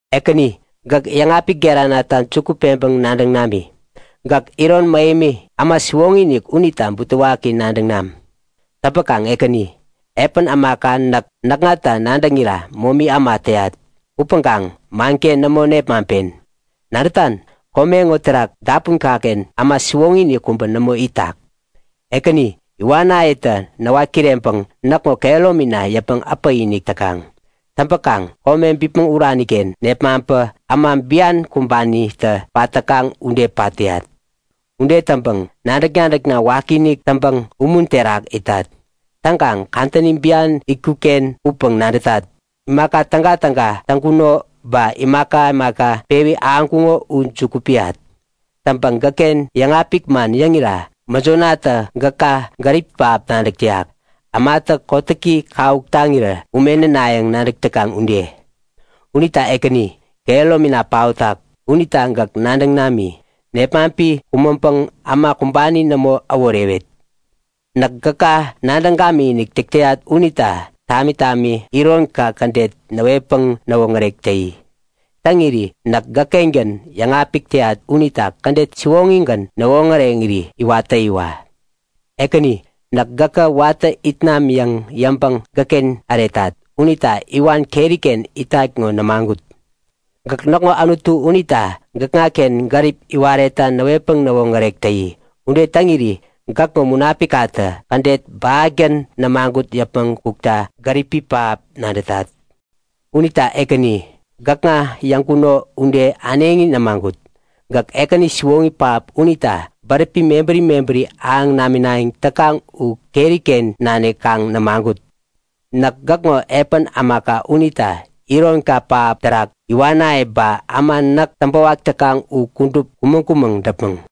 Ekäni gäk yäŋapik geranata juku peŋpäŋ nadäŋ nami. Gäk iron mähemi, äma siwoŋi-inik unita butewaki nadäŋ nam. Täŋpäkaŋ Ekäni, epän ämaka näk, näkŋata nadäŋira momi äma täyat upäŋkaŋ manken nämo nepmaŋpen. Nadätan, kome ŋo terak dapunkaken äma siwoŋi-inik kubä nämo itak. Ekäni, iwanayetä näwat kireŋpäŋ näkŋo kehäromina yäpmäŋ äpäk-inik täkaŋ. Täŋpäkaŋ kome bipmäŋ uraniken nepmaŋpä äma bian kumbanitä pat täkaŋ ude pat täyat. Ude täŋpäŋ nadäk-nadäkna wakiinik täŋpäŋ umun terak itat. Täŋkaŋ, kadäni bian itkutken upäŋ nadätat. Imaka tägatäga täŋkuno ba imaka imaka pewi ahäŋkuŋo u juku piyat. Täŋpäŋ gäkken yäŋapik man yäŋira mäjonatä gäka gäripi pähap nadäk täyak, ämatä kotäki kawuk taŋirä ume nänayäŋ nadäk täkaŋ ude. Unita Ekäni, kehäromina paotak unita gäk nadäŋ nami. Nepmaŋpi kumäŋpäŋ äma kumbani nämo äworewet! Näk gäka nadäŋ gamikinik täk täyat unita tami tami ironka kädet näwetpäŋ näwoŋärek täyi. Täŋiri näk gäkkengän yäŋapik täyat unita kädet siwoŋigän näwoŋäreŋiri iwat täyiwa. Ekäni, näk gäkä watä it nam yäŋ yäŋpäŋ gäkken äretat unita iwan keriken itat ŋo nämagut. Gäk näkŋo Anutu unita gäkŋaken gärip iwaretta näwetpäŋ näwoŋärek täyi. Ude täŋiri gäkŋo Munapikkatä kädet bähatgän nämagut yäpmäŋ kukta gäripi pähap nadätat. Unita Ekäni, gäkŋa yäŋkuno ude äneŋi nämagut. Gäk Ekäni siwoŋi pähap unita bäräpi mebäri mebäri ahäŋ naminayäŋ täkaŋ u keriken nanik kaŋ nämagut. Näk gäkŋo epän ämaka unita ironka pähap terak iwanaye ba äma näk täŋpäwak täkaŋ u kudup kumäŋ-kumäŋ däpmäŋ.